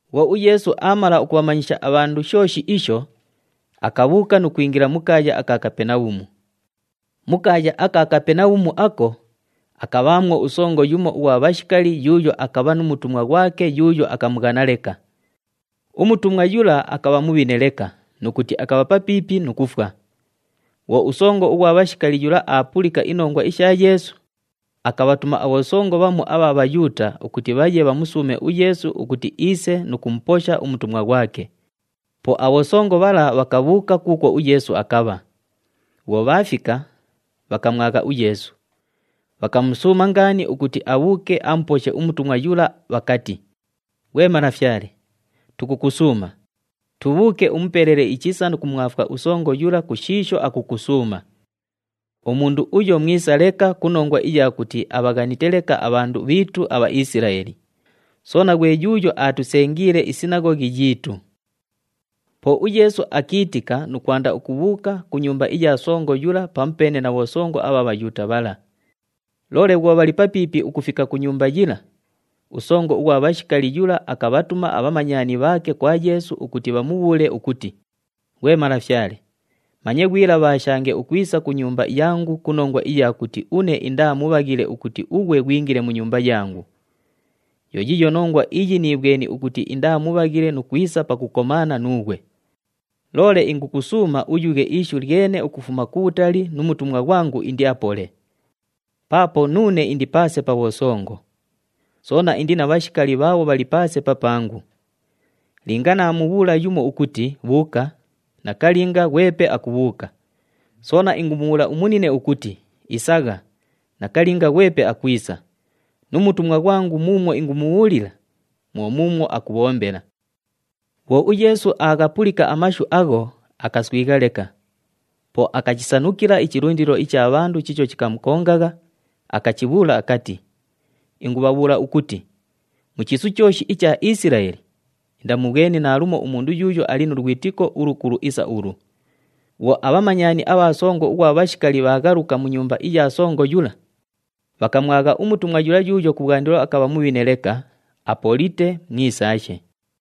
Bhwo uYeesu aamala ukubhamanyisha abhandu shooshi isho, akabhuuka nu kwingila mu kaaya aka Kapenabhumu. Mu kaaya aka Kapenabhumu ako, akabhaamwo usongo yumo ughwa bhashikali yuuyo akabha nu mutumwa ghwake yuuyo akamughana leka. Umutumwa yula akabha mubhine leka nu kuti akabha papiipi nu kufwa. Bhwo usongo ughwa bhashikali yula aapulika inongwa isha Yeesu, akabhatuma abhosongo bhamu abha Bhayuuta ukuti bhaye bhamusuume uYeesu ukuti iise nu kumuposha umutumwa ghwake. Po abhosongo bhala bhakabhuuka kuukwo uYeesu akabha. Bhwo bhaafika, bhakamwagha uYeesu, bhakamusuuma ngaani ukuti abhuuke amuposhe umutumwa yula bhakati, “Ghwe Malafyale, tukukusuuma, tubhuuke umupelele ichisa nu kumwafwa usongo yula ku shiisho akukusuuma. Umundu uyo mwisa leka ku nongwa iya kuti abhaghanite leka abhandu bhiitu aBhaisilaeli, soona ghwe yuuyo aatusengiile isinaghoghi yiitu.” Po uYeesu akiitika nu kwanda ukubhuuka ku nyumba iya songo yula pamupeene na bhosongo abha Bhayuuta bhala. Loole bhwo bhali papiipi ukufika ku nyumba yila, usongo ughwa bhashikali yula akabhatuma abhamanyani bhaake kwa Yeesu ukuti bhamubhuule ukuti, “Ghwe Malafyale, manye ghwilabhaashange ukwisa ku nyumba yangu ku nongwa iya kuti une indaa mubhaghile ukuti ughwe ghwingile mu nyumba yangu. Yo yiiyo nongwa iyi niibhweni ukuti indaa mubhaghile nu kwisa pakukomaana nuughwe. Loole ingukusuuma uyughe ishu lyene ukufuma kubhutali nu mutumwa ghwangu indiapole. Paapo nuune indi paase pa bhosongo. Soona indi na bhashikali bhaabho bhali paase papangu. Linga naamubhuula yumo ukuti, ‘Bhuuka!’ Nakalinga, ghwepe akubhuuka. Soona ingumubhuula umunine ukuti, ‘Isagha!’ Nakalinga, ghwepe akwisa. Nu mutumwa ghwangu muumwo ingumubhuulila, mwo muumwo akubhombela.” Bhwo uYeesu aaghapulika amashu agho, akaswigha leka. Po akachisanukila ichilundilo icha bhandu chiicho chikamukongagha, akachibhuula akati, “Ingubhabhuula ukuti, mu chiisu chooshi icha Isilaeli, indamubhweni naalumo umundu yuuyo ali nu lwitiko ulukulu isa ulu!” Bhwo abhamanyani abha songo ughwa bhashikali bhaaghaluka mu nyumba iya songo yula, bhakamwagha umutumwa yula yuuyo kubhwandilo akabha mubhine leka, apolite, mwisaashe.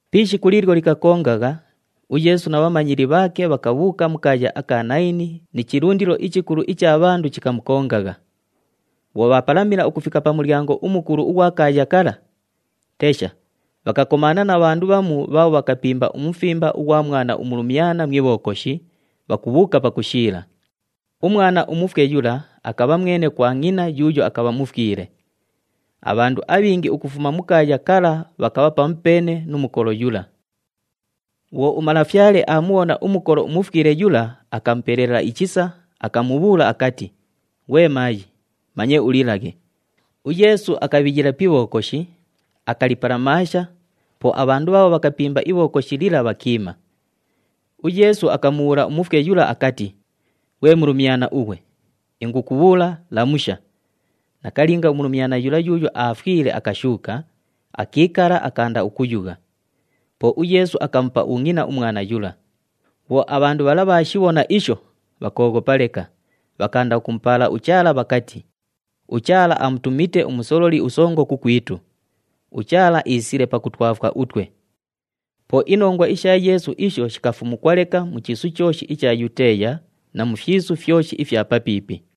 Pi ishiku liilyo likakongagha, uYeesu na bhamanyili bhaake bhakabhuuka mu kaaya aka Nayini ni chilundilo ichikulu icha bhandu chikamukongagha. Bhwo bhaapalamila ukufika pa mulyango umukulu ughwa kaaya kala, tesha, bhakakomaana na bhandu bhamu bhaabho bhakapimba umufimba ughwa mwana umulumyana mu ibhokoshi, bhakubhuuka pakushiila. Umwana umufwe yula akabha mwene kwa ngʼina yuuyo akabha mufwile. Abhandu abhingi ukufuma mu kaaya kala bhakabha pamupeene nu mukolo yula. Bhwo uMalafyale aamubhona umukolo umufwile yula, akamupelela ichisa, akamubhuula akati, “Ghwe maayi, manye ulilaghe.” UYeesu akabhiyila pi ibhokoshi, akalipalamaasha, po abhandu bhaabho bhakapimba ibhokoshi lila bhakiima. UYeesu akamubhuula umufwe yula akati, “Ghwe mulumyana ughwe! Ingukubhuula, lamusha!” Nakalinga, umulumyana yula yuuyo aafwile akashuuka, akiikala, akaanda ukuyugha. Po uYeesu akamupa ungʼina umwana yula. Bhwo abhandu bhala bhaashibhona isho, bhakooghopa leka, bhakaanda ukumupaala uChaala bhakati, “UChaala amutumite umusololi usongo kukwitu! UChaala iisile pakutwafwa utwe!” Po inongwa isha Yeesu isho shikafumukwa leka mu chiisu chooshi icha Yuteeya na mu fyisu fyoshi ifya papiipi.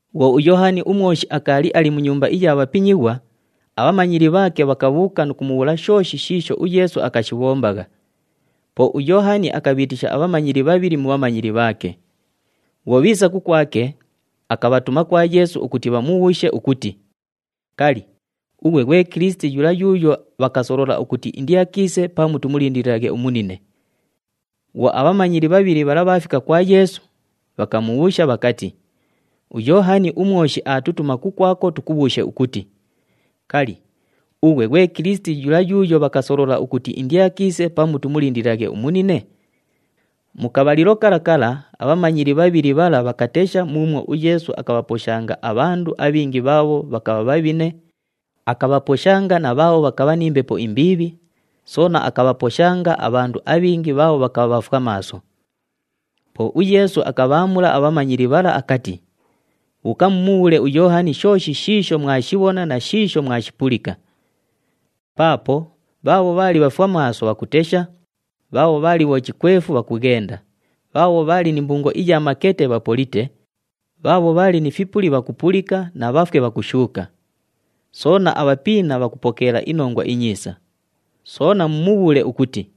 Bhwo uYoohani uMwoshi akaali ali mu nyumba iya bhapinyighwa, abhamanyili bhaake bhakabhuuka nu kumubhuula shooshi shiisho uYeesu akashibhombagha. Po uYoohani akabhiitisha abhamanyili bhabhili mu bhamanyili bhaake. Bhwo bhiisa kukwake, akabhatuma kwa Yeesu ukuti bhamubhuushe ukuti, “Kali, ughwe ghwe Kilisiti yula yuuyo bhakasolola ukuti indiakiise pamu tumulindililaghe umunine?” Bhwo abhamanyili bhabhili bhala bhaafika kwa Yeesu, bhakamubhuusha bhakati, “UYoohani uMwoshi aatutuma kukwako tukubhuushe ukuti, ‘Kali, ughwe ghwe Kilisiti yula yuuyo bhakasolola ukuti indiakiise pamu tumulindililaghe umunine?’” Mu kabhalilo kala kala abhamanyili bhabhili bhala bhakatesha muumwo uYeesu akabhaposhanga abhandu abhingi bhaabho bhakabha bhabhine, akabhaposhanga na bhaabho bhakabha ni mbepo imbiibhi, soona akabhaposhanga abhandu abhingi bhaabho bhakabha bhafwamaaso. Po uYeesu akabhaamula abhamanyili bhala akati, “Bhuuka mumubhuule uYoohani shooshi shiisho mwashibhona na shiisho mwashipulika. Paapo bhaabho bhaali bhafwamaaso bhakutesha, bhaabho bhaali bhochikwefu bhakughenda, bhaabho bhaali ni mbungo iya makete bhapolite, bhaabho bhaali ni fipuli bhakupulika na bhafwe bhakushuuka. Soona, abhapiina bhakupokeela iNongwa iNyiisa. Soona mumubhuule ukuti,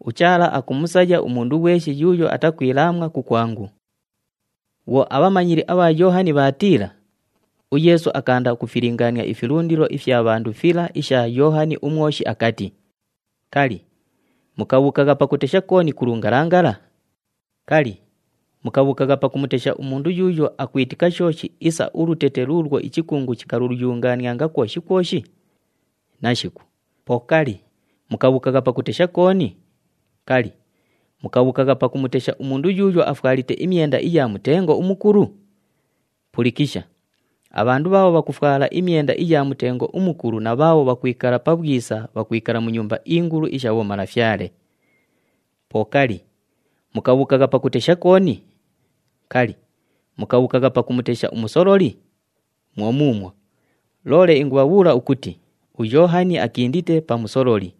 ‘UChaala akumusaya umundu ghweshi yuuyo atakwilaamwa kukwangu.’” Bhwo abhamanyili abha Yoohani bhaatiila, uYeesu akaanda ukufilingaania ifilundilo ifya bhandu fila isha Yoohani uMwoshi akati, “Kali, mukabhuukagha pakutesha kooni ku lungalangala? Kali, mukabhuukagha pakumutesha umundu yuuyo akwitika shooshi isa ulutete luulwo ichikungu chikaluyungaanianga kwoshi kwoshi? Nashiku. Po kali, mukabhuukagha pakutesha kooni? Kali, mukabhuukagha pakumutesha umundu yuuyo afwalite imyenda iya mutengo umukulu? Pulikisha, abhandu bhaabho bhakufwala imyenda iya mutengo umukulu na bhaabho bhakwikala pabhwisa, bhakwikala mu nyumba ingulu isha bhomalafyale! Po kali, mukabhuukagha pakutesha kooni? Kali, mukabhuukagha pakumutesha umusololi? Mwo muumwo, loole ingubhabhuula ukuti uYoohani akindite pa musololi.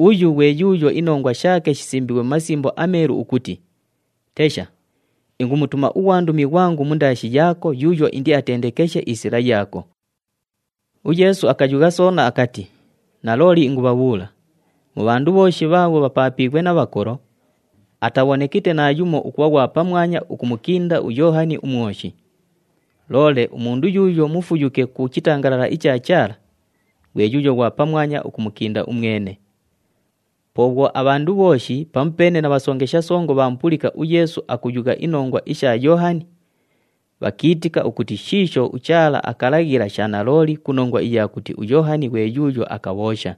Uyu ghwe yuuyo inongwa shaake shisimbiighwe mu Masimbo aMeelu ukuti, ‘Tesha, ingumutuma ughwandumi ghwangu mundaashi yaako yuuyo indiakatendekeshe isila yaako.’” UYeesu akayugha soona akati, “Nalooli ingubhabhuula, mu bhandu bhooshi bhaabho bhapaapiighwe na bhakolo, atabhonekite naayumo ukubha ghwa pamwanya ukumukinda uYoohani uMwoshi. Loole umundu yuuyo mufuyuke ku chitangalala icha Chaala, ghwe yuuyo ghwa pamwanya ukumukinda umwene.” Po bhwo abhandu bhooshi pamupeene na bhasongesha songo bhaamupulika uYeesu akuyugha inongwa isha Yoohani, bhakiitika ukuti shiisho uChaala akalaghila sha nalooli ku nongwa iya kuti uYoohani ghwe yuuyo akabhoosha.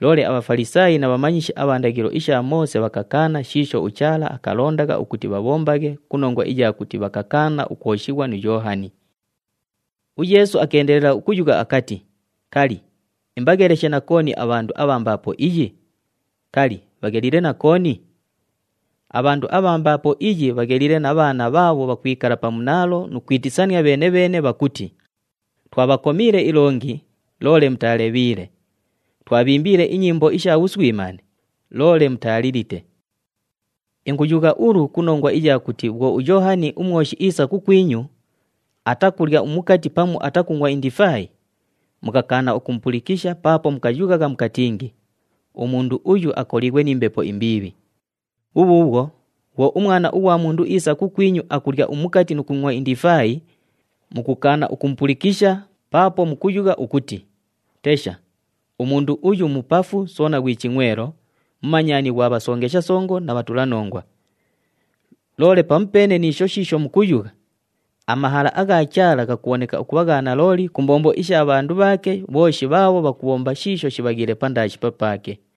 Loole aBhafalisaayi na bhamanyishi abha ndaghilo isha Moose bhakakaana shiisho uChaala akalondagha ukuti bhabhombaghe ku nongwa iya kuti bhakakaana ukwoshighwa nu Yoohani. UYeesu akeendelela ukuyugha akati, “Kali, imbagheleshe na kooni abhandu abha mbaapo iyi? Kali, bhagheliile na kooni? Abhandu abha mbaapo iyi bhagheliile na bhaana bhaabho bhakwikala pa munaalo nu kwitisania bheene-bheene bhakuti, ‘Twabhakomiile ilongi, loole mutaalebhiile. Twabhiimbiile inyimbo isha bhuswimaane, loole mutaalilite!’ “Inguyugha ulu ku nongwa iya kuti bhwo uYoohani uMwoshi iisa kukwinyu, atakulya umukati pamu atakungʼwa indifaayi, mukakaana ukumupulikisha paapo mukayughagha mukatingi, ‘Umundu uyu akoliighwe ni mbepo imbiibhi.’ Bhubhuubhwo, bhwo uMwana ughwa Mundu iisa kukwinyu akulya umukati nu kungʼwa indifaayi, mukukaana ukumupulikisha paapo mukuyugha ukuti, ‘Tesha! Umundu uyu mupafu soona ghwi chingʼwelo, mumanyani ghwa bhasongesha songo na bhatulanongwa!’ Loole pamupeene ni isho shiisho mukuyugha, amahala agha Chaala ghakubhoneka ukubha gha nalooli ku mbombo isha bhandu bhaake bhooshi bhaabho bhakubhomba shiisho shibhaghiile pandaashi papaake.”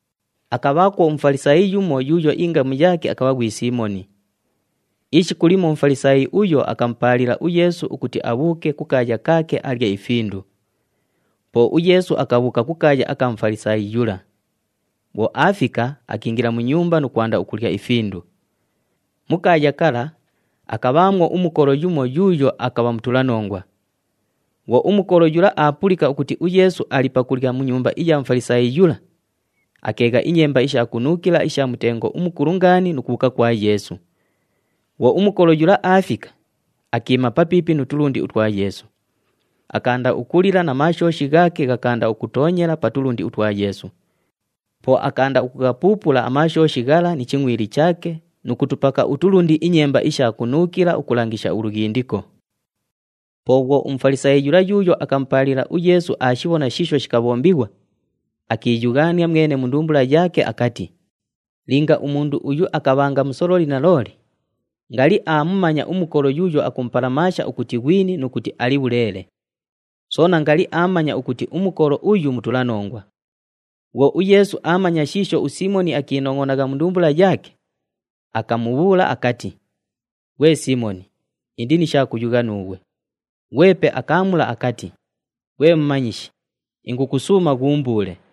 Akabhaakwo uMufalisaayi yumo yuuyo ingamu yaake akabha ghwi Siimoni. Ishiku limo uMufalisaayi uyo akamupaalila uYeesu ukuti abhuuke kukaaya kaake alye ifindu. Po uYeesu akabhuuka kukaaya aka Mufalisaayi yula. Bhwo aafika, akiingila mu nyumba nu kwanda ukulya ifindu. Mu kaaya kala, akabhaamwo umukolo yumo yuuyo akabha mutulanongwa. Bhwo umukolo yula aapulika ukuti uYeesu ali pakulya mu nyumba iya Mufalisaayi yula, akeegha inyemba isha kunuukila isha mutengo umukulu ngaani nu kubhuuka kwa Yeesu. Bhwo umukolo yula aafika, akiima papiipi nu tulundi utwa Yeesu. Akaanda ukulila na maashooshi ghaake ghakaanda ukutoonyela pa tulundi utwa Yeesu. Po akaanda ukughapuupula amaashooshi ghala ni chingʼwili chaake nu kutupaka utulundi inyemba isha kunuukila ukulangisha ulughindiko. Po bhwo uMufalisaayi yula yuuyo akamupaalila uYeesu aashibhona shiisho shikabhombighwa, akiiyughaania mwene mu ndumbula yaake akati, “Linga umundu uyu akabhanga musololi nalooli, ngali aamumanya umukolo yuuyo akumupalamaasha ukuti ghwini nu kuti ali bhuleele. Soona ngali aamanya ukuti umukolo uyu mutulanongwa.” Bhwo uYeesu aamanya shiisho uSiimoni akiinongʼonagha mu ndumbula yaake, akamubhuula akati, “Ghwe Siimoni, indi ni sha kuyugha nuughwe.” Ghwepe akaamula akati, “Ghwe Mumanyishi, ingukusuuma ghuumbuule.”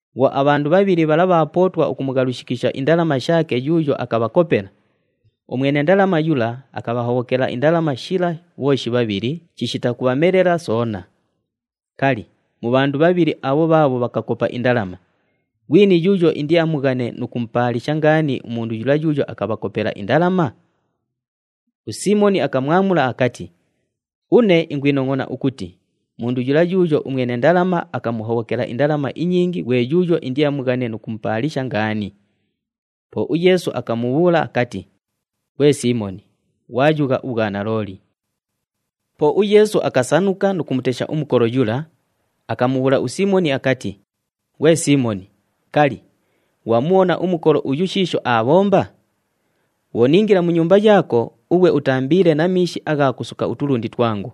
Bhwo abhandu bhabhili bhala bhaapootwa ukumughalushikisha indalama shaake yuuyo akabhakopela, umwene ndalama yula akabhahobhokela indalama shila bhooshi bhabhili chishita kubhamelela soona. Kali, mu bhandu bhabhili abho bhaabho bhakakopa indalama, ghwini yuuyo indiamughane nu kumupaalisha ngaani umundu yula yuuyo akabhakopela indalama?” USiimoni akamwamula akati, “Une ingwinongʼona ukuti mundu yula yuuyo umwene ndalama akamuhobhokela indalama inyingi ghwe yuuyo indiamughane nu kumupaalisha ngaani.” Po uYeesu akamubhuula akati, “Ghwe Siimoni, ghwayugha ubhwanalooli.” Po uYeesu akasanuka nu kumutesha umukolo yula, akamubhuula uSiimoni akati, “Ghwe Siimoni, kali, ghwamubhona umukolo uyu shiisho aabhomba? Bhwo niingila mu nyumba yaako, ughwe utaambiile na miishi agha kusuka utulundi twangu,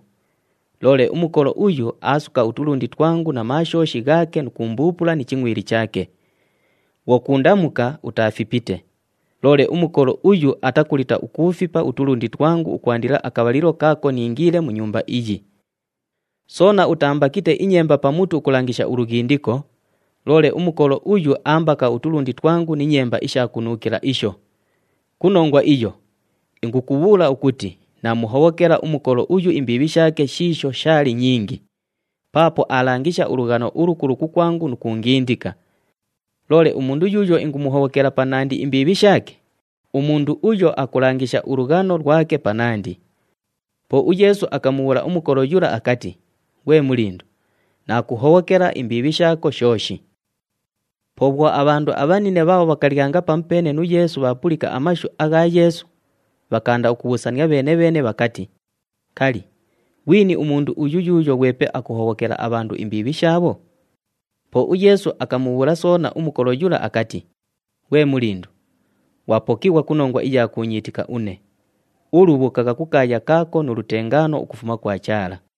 loole umukolo uyu aasuka utulundi twangu na maashooshi ghaake nu kuumbuupula ni chingʼwili chaake. Bhwo kuundamuka, utaafipite, loole umukolo uyu atakulita ukuufipa utulundi twangu ukwandila akabhalilo kaako niingiile mu nyumba iyi. Soona utaambakite inyemba pa mutu ukulangisha ulughindiko, loole umukolo uyu aambaka utulundi twangu ni nyemba isha kunuukila isho. Ku nongwa iyo, ingukubhuula ukuti naamuhobhokela umukolo uyu imbiibhi shaake shiisho shaali nyingi, paapo aalangisha ulughano ulukulu kukwangu nu kuungindika. Loole umundu yuuyo ingumuhobhokela panandi imbiibhi shaake, umundu uyo akulangisha ulughano lwake panandi.” Po uYeesu akamubhuula umukolo yula akati, “Ghwe mulindu, naakuhobhokela imbiibhi shaako shooshi.” Po bhwo abhandu abhanine bhaabho bhakalyanga pamupeene nu Yeesu bhaapulika amashu agha Yeesu, bhakaanda ukubhuusania bheene-bheene bhakati, “Kali, ghwini umundu uyu yuuyo ghwepe akuhobhokela abhandu imbiibhi shaabho?” Po uYeesu akamubhuula soona umukolo yula akati, “Ghwe mulindu, ghwapokighwa ku nongwa iya kuunyiitika une. Ulu bhuukagha kukaaya kaako nu lutengaano ukufuma kwa Chaala!”